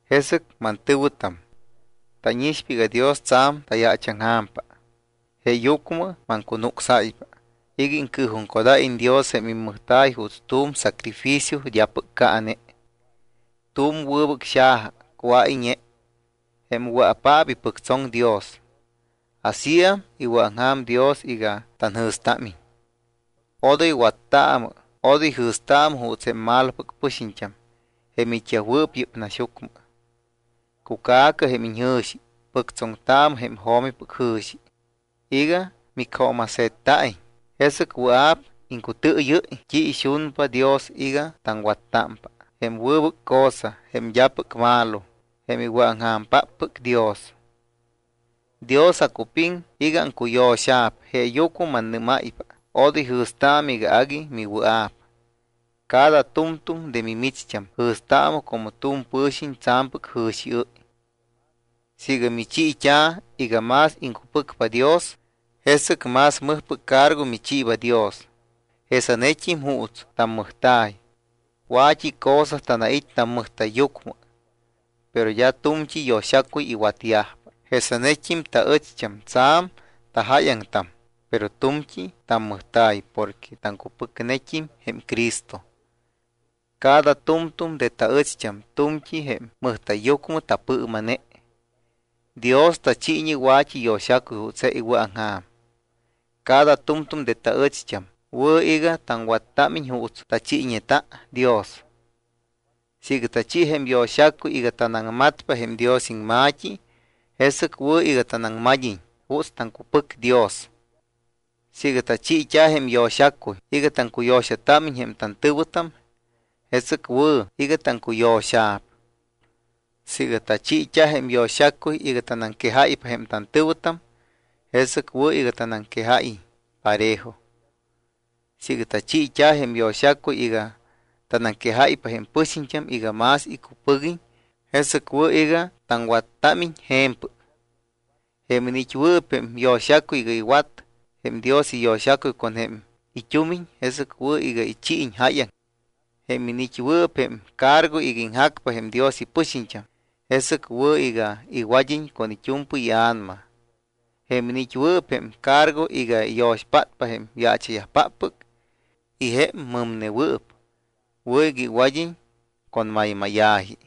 Jesɨc mantɨ̱wɨtam, tánixpa iga Dios tsa̱m tayaachaŋja̱mpa. Jeeyucmɨ maŋcunucsáypa iga iŋcɨɨjuŋcodáyiñ Dios jém immɨjta̱y juuts tu̱m sacrificio d́apɨc caane, tu̱m wɨbɨc xaja cuáyñe jém wɨa̱paap ipɨctsoŋ Dios. Asíam iwɨ̱aŋja̱m Dios iga tanjɨ̱stámiñ. Odoy wattaamɨ, odoy jɨ̱staamɨ juuts jém malopɨc pɨxiñt́am jém it́yajwɨɨp yɨ́p naxyucmɨ. Cuca̱cɨ jém iñjɨ̱xi, pɨctsoŋtaamɨ jém jo̱mipɨc jɨ̱xi iga micjooma̱se̱tta̱iñ. Jesɨc wɨa̱p iŋcutɨɨyɨ́y t́i ixunpa Dios iga taŋwattámpa, jém wɨbɨc cosa, jém d́apɨc malo, jém iwɨ̱aŋja̱mpáppɨc Dios. Dios acupiŋ iga aŋcuyo̱xa̱p jeeyucmɨ mannɨ́máypa, odoy jɨ̱staamɨ iga agui miwɨa̱p. Cada tu̱mtu̱m de mimicht́am jɨ̱staamɨ como tu̱m pɨ̱xiñ tsa̱mpɨc jɨ̱xiɨ́y. Siiga michiit́a̱ iga más iŋcupɨcpa Dios, jesɨc más mɨjpɨc cargo michiiba Dios. Jesanet́im juuts tammɨjta̱y. Wa̱t́i cosa tanait́ tammɨjta̱yyucmɨ. Pero d́a tu̱mt́i yo̱xacuy iwatyajpa. Jesanet́im taɨcht́am tsa̱m tajáyaŋtam, pero tu̱mt́i tamɨjta̱y porque taŋcupɨcnet́im jém Cristo. Cada tu̱mtu̱m de taɨcht́am tu̱mtí jém mɨjta̱yyucmɨ tapɨɨma̱ne. Dios tachiiñe wa̱t́i yo̱xacuy juuts je iwɨ̱aŋja̱m. Cada tu̱mtu̱m de taɨcht́am wɨ̱ iga taŋwattámiñ juuts tachiiñeta Dios. Siiga tachi jém yo̱xacuy iga tanaŋmatpa jém Dios iŋma̱t́i, jesɨc wɨ̱ iga tanaŋmad́iñ juuts taŋcupɨc Dios. Siiga tachiit́a̱ jém yo̱xacuy iga taŋcuyo̱xatámiñ jém tantɨ̱wɨtam, jesɨc wɨ̱ iga taŋcuyo̱xa̱p. Siiga tachiit́a jém yo̱xacuy iga tanaŋquejáypa jém tantɨ̱wɨtam, jesɨc wɨ̱ iga tanaŋquejáyiñ parejo. Siiga tachiit́a̱ jém yo̱xacuy iga tanaŋquejáypa jém pɨxiñt́am iga más icupɨguiñ, jesɨc wɨ̱ iga taŋwattámiñ je̱mpɨc. Jém iniit́wɨɨp jém yo̱xacuy iga iwat jém Dios iyo̱xacuy con jém it́umiñ, jesɨc wɨ̱ iga ichiiñ jáyaŋ. Jém iniit́wɨɨp jém cargo iga iŋjacpa jém Dios ipɨxiñt́am, jesɨc wɨ̱ iga iwad́iñ con it́u̱mpɨy ia̱nama. Jém iniit́wɨɨp jém cargo iga iyo̱xpátpa jém yaacha̱yajpáppɨc y jém mɨmnewɨɨp, wɨ̱ iga iwad́iñ con maymáya̱ji.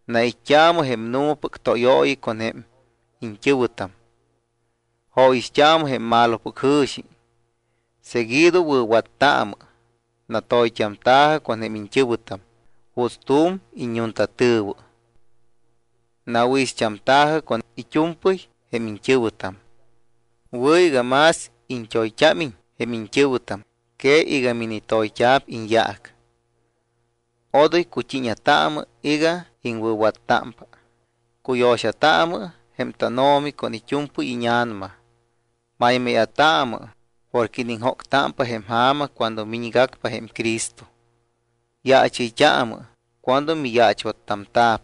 Nait́t́aamɨ jém nu̱mapɨc tóyooyi con jém iñt́ɨ̱wɨtam. Jóyixt́aamɨ jém malopɨc jɨ̱xi. Seguido wɨ̱wattaamɨ. Natoyt́amta̱jɨ con jém iñt́ɨ̱wɨtam juuts tu̱m iññuntatɨ̱wɨ. Nawɨ̱ixt́amta̱jɨ con it́u̱mpɨy jém iñt́ɨ̱wɨtam. Wɨ̱ iga más iñt́oyt́ámiñ jém iñt́ɨ̱wɨtam que iga minitoyt́a̱p iñyaac. Odoy cut́iña̱taamɨ iga iŋwɨ̱wattámpa. Cuyo̱xataamɨ jém tánO̱mi con it́u̱mpɨy íña̱nama. Maymáya̱taamɨ porque iniŋjóctámpa jém ja̱ma cuando miñgacpa jém Cristo. Yaachɨyt́aamɨ cuando miyaachwattamta̱p.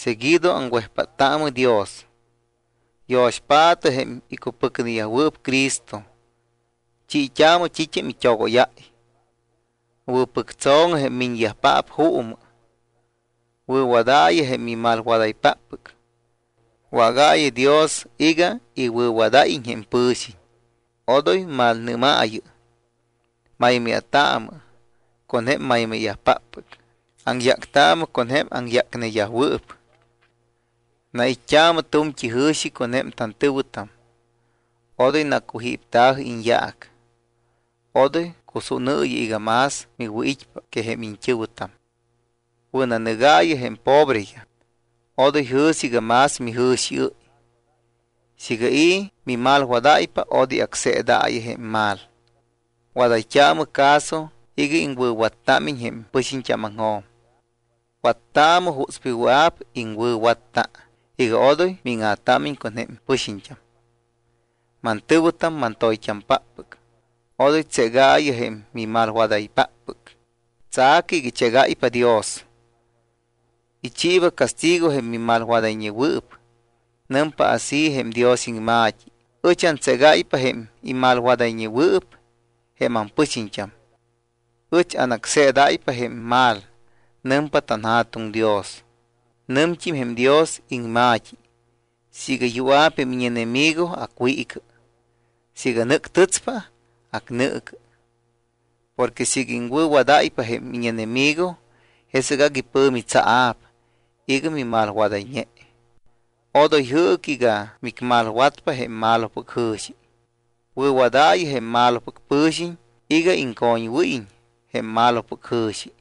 Seguido aŋwejpáttaamɨ Dios. Yo̱xpaatɨ jém icupɨcneyajwɨɨp Cristo, chiit́aamɨ t́it́am it́ogóyáy. Wɨ̱pɨctso̱ŋɨ jém miñyajpáppɨc juumɨ. Wɨ̱wadaayɨ jém mimalwadaypáppɨc. Wágaayɨ Dios iga iwɨ̱wadáyiñ jém pɨ̱xiñ. Odoy malnɨ́maayɨ. Maymáya̱taamɨ con jém maymáya̱yajpáppɨc. Aŋyáctaamɨ con jém aŋyácneyajwɨɨp. Nait́t́aamɨ tu̱mt́i jɨ̱xi con jém tantɨ̱wɨtam. Odoy nacujípta̱jɨ iñyaac. Odoy cusúnɨɨyɨ iga más miwɨ̱it́pa que jém iñt́ɨ̱wɨtam. Wɨ̱nanɨgaayɨ jém pobreyaj. Odoy jɨ̱sɨ iga más mijɨ̱xiɨ́y. Siiga i̱ mimalwadáypa, odoy acseedaayɨ jém mal. Wadayt́aamɨ caso iga iŋwɨ̱wattámiñ jém pɨxiñt́ámaŋjo̱m. Wattaamɨ jutspɨy wɨa̱p iŋwɨ̱watta iga odoy míŋa̱támiñ con jém pɨxiñt́am. Mantɨ̱wɨtam mantoyt́ampáppɨc, odoy tségaayɨ jém mimalwadaypáppɨc. Tsa̱cɨ iga ichégáypa Dios. Ichiiba castigo jém mimalwadayñewɨɨp. Nɨmpa así jém Dios iŋma̱t́i: “Ɨch antségáypa jém imalwadayñewɨɨp jém ampɨxiñt́am. Ɨch anácseedáypa jém mal. Nɨmpa tanJa̱tuŋ Dios.” Nɨmt́im jém Dios iŋma̱t́i: “Siiga yua̱p jém íñenemigo, acwiicɨ. Siiga nɨ́ctɨtspa, acnɨɨcɨ. Porque siiga iŋwɨ̱wadáypa jém íñenemigo, jesɨc agui pɨ̱mi tsaa̱p iga mimalwadayñe.” Odoy jɨɨcɨ iga micmalwatpa jém malopɨc jɨ̱xi. Wɨ̱wadaayɨ jém malopɨc pɨ̱xiñ iga iŋcoñwɨ́yiñ jém malopɨc jɨ̱xi.